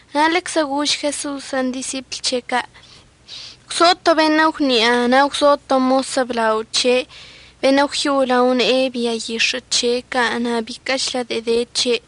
Na' ḻeczə gož Jeso'osən' disipl c̱he' ca': ―Gwzo to beṉə' gwni'a na' gwzo to mos əblao c̱he' beṉə' gwyo'o lao ne'e bia yix̱ə' c̱he' ca' na' biquə'əchlə de'en de c̱he'.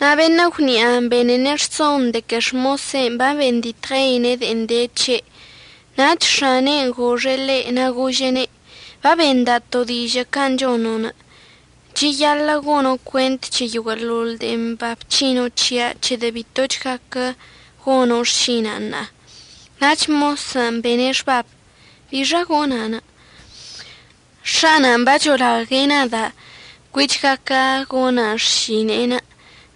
Na' beṉə' gwni'anə' benene' rson de que xmosen' babenditɉeine' de'en de c̱he'. Nach x̱ane'en goxe' ḻe' na' gože'ene': “Babenda' to dižə' can' chono'. Cheyaḻə' gono' cuent c̱he yoguə'əḻoḻ de'en babc̱hino' c̱hia' c̱hedə' bitoch gaquə gono' xšina'anə' ṉa'a.” Nach mosən' bene' xbabən': “¿Bixa gona'? X̱ana'an bacholague' nada' cuich gaquə gona' xšine'enə',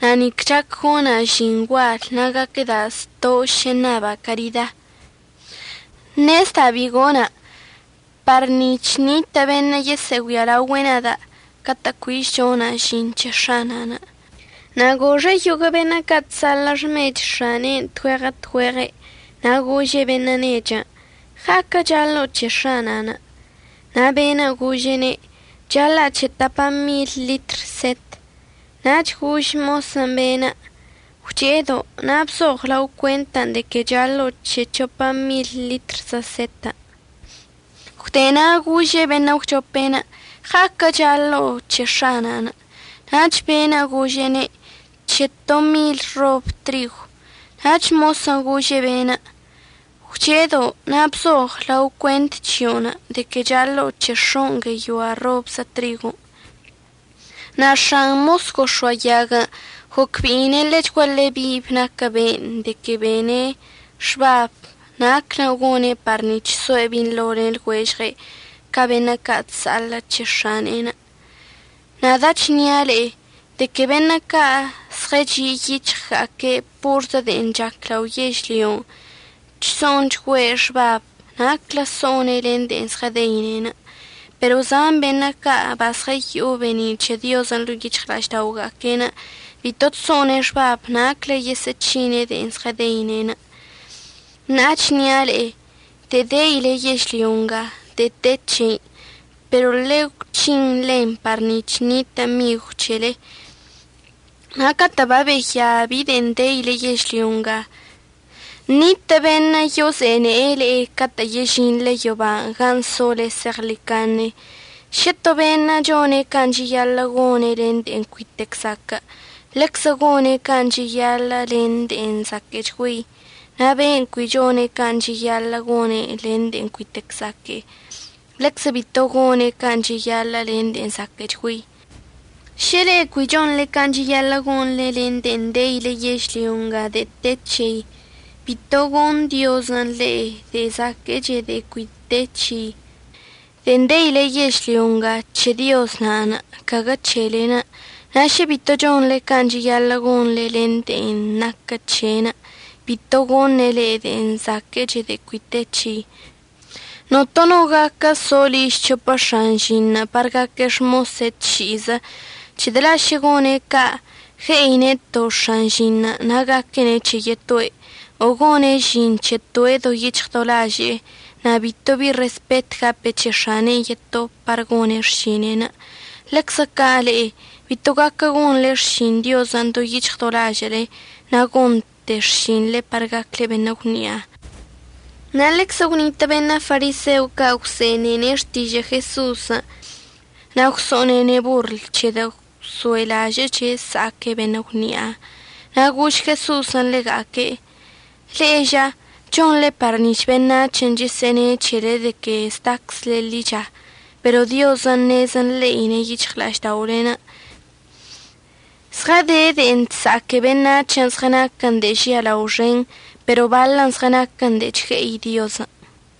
na' nic chac gona' žin gual na' gaquəda' zto' šə ṉaba' carida. Ṉezda' bi gona' par nic̱h ṉitə' beṉə' yesə'əgüialaogüe' nada' catə' cuich chona' žin c̱he x̱ana'an.” Na' goxe' yoguə' beṉə' ca' chsa'aḻə' xmech x̱ane'enə' tgüeɉə tgüeɉe'. Na' gože' beṉə' nechən': “¿Ɉa'aquə' chaḻo'o c̱he x̱ana'anə'?” Na' be'enə' gože'ene': “Chaḻa'a c̱he tapa mil ḻitr set.” Nach gož mosən' be'enə': “Gwche'edo', na' bzoɉ lao cuentən' de que chaḻo'o c̱he c̱hopa mil ḻitrzə setən'.” Gwde na' gože' beṉə' əgwchopen': “¿Ɉa'aquən' chaḻo'o c̱he x̱ana'anə'?” Nach be'enə' gože'ene': “C̱he to mil rob trigw.” Nach mosən' gože' be'enə': “Gwche'edo', na' bzoɉ lao cuent c̱hio'onə' de que chaḻo'o c̱he x̱on' gueyoa robzə trigon'.” Na' x̱an mos gox̱oayaguən' gocbe'ine' ḻechguaḻe bib naquə be'enə' de'en bene' xbab naclən' gone' par nic̱h soe' binḻo len lɉuežɉe' ca' beṉə' ca' chsa'aḻə' c̱he x̱ane'en. Nada' chnia' le'e de que beṉə' ca' zɉəchi' yic̱hɉga'aque' porzə de'en chac lao yežlyon' chso'onchgüe' xbab naclən' so'one' len de'en zɉədeine'. Pero zan beṉə' ca' bazɉəyo'o be'eni' c̱he Diozən' ḻo'o yic̱hɉla'ažda'oga'aque'enə' bito chso'one' xbab naclən' yesə'əc̱hine' de'en zɉədeine'. Ṉa'a əchnia' le'e, de'en deile yežlyo nga de'e te c̱hein', pero ḻegwc̱hin ḻen par nic̱h ṉitə' migw c̱hele, na' catə' babeya bi de'en deile yežlyo nga, ṉitə' beṉə' yozene'e le'e catə' yežinḻe yoban' gan' sole zeɉḻicaṉe. Šə to beṉə' chone' can' cheyaḻə' gone' len de'e cuitec zaquə' ḻeczə gone' can' cheyaḻə' len de'e zaquə'əchgüei, na' beṉə' cui chone' can' cheyaḻə' gone' len de'e cuitec zaquə', ḻeczə bito gone' can' cheyaḻə' len de'e zaquə'əchgüei. Šə le'e cui chonḻe can' cheyaḻə' gonḻe len de'en deile yežlyo nga de'e te c̱hei, bito goṉ Diozən' le'e de'e zaquə'əche de'en cui te c̱hei. De'en deile yežlyo nga c̱he Dioz na'anə', caguə c̱helen'. Na' šə bito chonḻe can' cheyaḻə' gonḻe len de'en naquə c̱he'enə', bito goṉe' le'e de'e zaquə'əche de'e cui te c̱hei. Notono no gaquə so liž c̱hopə x̱an žin par gaque' xmosga'aque' tši'izə, c̱hedə' la' šə gone' ca', gue'ine' to x̱an žinṉə' na' gaquene' c̱he yetoe', o gone' žin c̱he toe' do yic̱hɉ do laže'e na' bito bi respet gape' c̱he x̱ane'en yeto par gone' xšine'enə'. Ḻeczə ca' le'e bito gaquə gonḻe xšin Diozən' do yic̱hɉ do lažə'əle na' gonte xšinḻe par gacle beṉə' gwni'a. Na' ḻeczə gwnitə' beṉə' fariseo ca' gwse'enene' xtižə' Jeso'osən' na' gwso'onene' borl, c̱hedə' gwso'elažə'əche' əsa'aque' beṉə' gwni'a. Na' gož Jeso'osən' ḻega'aque': ―Le'e ža, chonḻe par nic̱h beṉac̱hən' chesə'əne' c̱hele de que zdaczle ḻicha, pero Diozən' ṉez nḻe'ine' yic̱hɉla'ažda'olen'. Zɉəde de'en chsa'aque beṉac̱hən' zɉənaquən de'e žialao xen pero baḻən zɉənaquən de'e chgue'i Diozən'.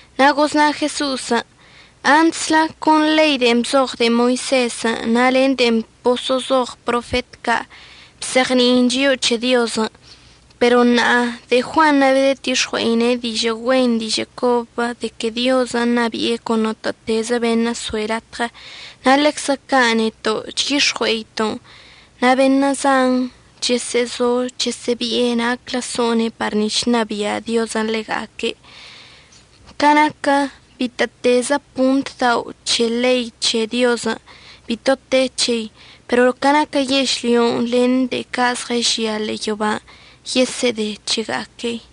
Na' gozna Jeso'osən': ―Antslə con ḻei de'en bzoɉ de'e Moisezən' na' len de'en boso'ozoɉ profet ca' bzeɉni'in chio'o c̱he Diozən'. Pero ṉa'a de'e Juanṉə' babedətix̱ɉui'e dižə' güen dižə' cobən' de que Diozən' ṉabi'e con notə'ətezə beṉə' soe' latɉə, na' ḻeczə ca' neto' chyix̱ɉue'eto'on. Na' beṉə' zan chesə'əzo chesə'əbi'e naclə so'one' par nic̱h ṉabia' Diozən' ḻega'aque'. Ca naquə bitə'ətezə pont dao' c̱he ḻei c̱he Diozən' bito te c̱hei pero ca naquə yežlyon' len de'e ca' zɉəžia ḻe'e yoban' yesə'əde c̱hega'aquei.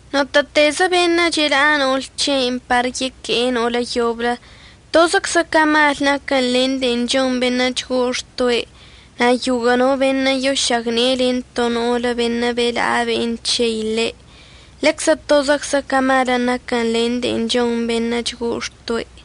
Notə'ətezə beṉə' chela'a no'ol c̱he'enə' par yeque'e no'olə yoblə, tozəczə ca malən' naquən len de'en chon beṉə' chgo'o xtoe'. Na' yoguə' no beṉə' yošagne'e len to no'olə beṉə' bela'a ben' c̱hei ḻe', ḻeczə tozəczə ca malən' naquən len de'en chon beṉə' chgo'o xtoe'.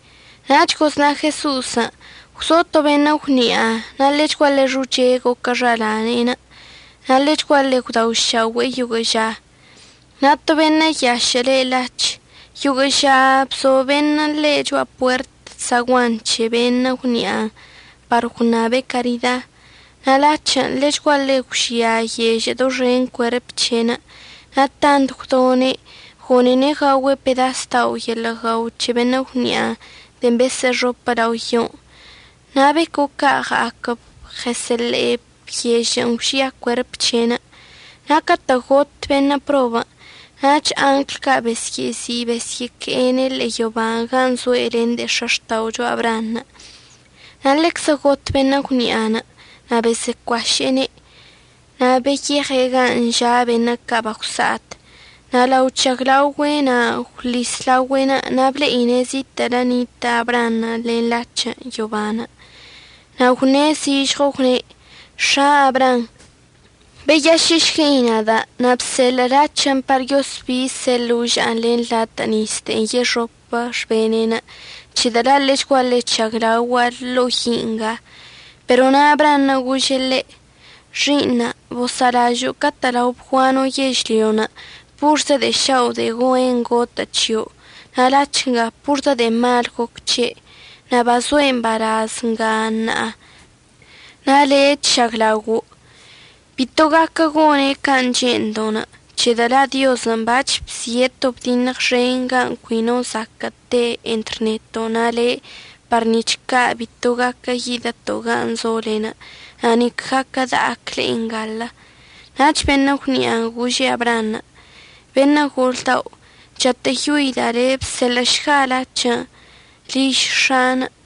Nach gozna Jeso'osən': ―Gwzo to beṉə' gwni'a, na' ḻechguaḻe xoche goquə xala'ane'enə', na' ḻechguaḻe gwdaošaogüe'e yoguə' ža. Na' to beṉə' yašə' le' Lac̱h yoguə' ža bzo beṉə' ḻe' cho'a puert zaguan c̱he beṉə' gwni'anə' par gwṉabe' carida. Na' Lac̱hən' ḻechguaḻe gwžia yežə' doxen cuerp c̱he'enə'. Na' tant gwdone' gone'ene' gaogüe' pedas dao' yeḻə' guao c̱he beṉə' gwni'anə' de'en besə'əxopə lao yon'. Na' beco' ca' ɉa'aquəb ɉəsə'əḻe'eb yežə'ən gwžia cuerp c̱he'enə'. Na' catə' got beṉə' probən', nach angl ca' besyə'əzi' besyə'əque'e ḻe' yoban' gan' zoe' len de'e x̱axta'ocho Abraanṉə'. Na' ḻeczə got beṉə' gwni'anə' na' bosə'əcuaše'ene'. Na' beyeɉe' gan' ža' beṉə' ca' bagwsa'at. Na' lao chžaglaogüe' na' gwḻis laogüe'enə' na' ble'ine' zitə'ələ nitə' Abraanṉə' lene' Lac̱hən' yoban'. Na' gwṉe' zižɉo gwne': “X̱a Abraam, beyašə'əlažə'əšguei nada', na' bseḻə' Lac̱hən' par yosbise' loža'an len latə' nis de'en yexopə xbene'enə' c̱hedə' la' ḻechguaḻe chžaglaogua' ḻo'o yi' nga.” Pero na' Abraanṉə' gože' ḻe': “Xi'iṉa' bosa'alažə' catə' lao bguano' yežlyon' porzə de'e šao' de'e güen gotə' c̱hio', na' Lac̱h nga porzə de'e mal goc c̱he'. Na' bazoe' mbalaz nga ṉa'a, na' le' chžaglaogo'. Bito gaquə gone' can' che'endo' c̱hedə' la' Diozən' bac̱h bzie' to bdiṉɉ xen ga cui no zaquə' te entr neto' na' le'e par nic̱h ca' bito gaquə yidəto' gan' zolen', na' nic gaquə da'ac le'e nga.” Nach beṉə' gwni'anə' gože' Abraanṉə': “Beṉə' gol dao', chatə'əyoida' le', bseḻə'əšga Lac̱hən' liž x̱a'anə'.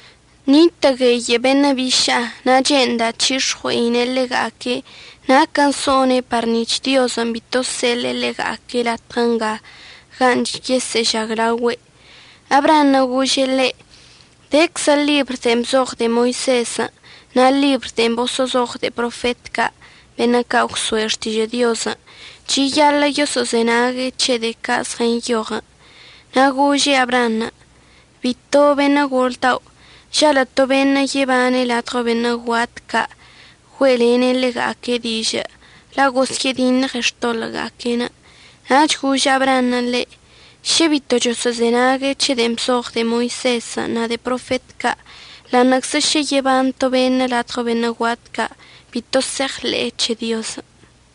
Nitə' gueyə' beṉə' biša'a, na' che'enda' c̱hix̱ɉue'ine' ḻega'aque' naquən' so'one' par nic̱h Diozən' bito əseḻe'e ḻega'aque' latɉə nga gan' yesə'əžaglaogüe'.” Abraanṉə' gože' ḻe': “Deczə ḻibr de'en bzoɉ de'e Moisezən' na' ḻibr de'en boso'ozoɉ de'e profet ca' beṉə' ca' gwso'e xtižə' Diozən'. Cheyaḻə' yoso'ozenague' c̱he de'e ca' zɉənyoɉən'.” Na' gože' Abraanṉə': “Bito beṉə' gol dao'. Žalə' to beṉə' yebane' ladɉo beṉə' guat ca' güe'elene' ḻega'aque' dižə', la' gosyə'ədiṉɉene' xtoḻə'əga'aque'enə'.” Nach gož Abraanṉə' ḻe': “Šə bito choso'ozenague' c̱he de'en bzoɉ de'e Moisezən' na' de'e profet ca', ḻa'aṉə'əczə šə yeban to beṉə' ladɉo beṉə' guat ca', bito se'eɉḻe'e c̱he Diozən'.”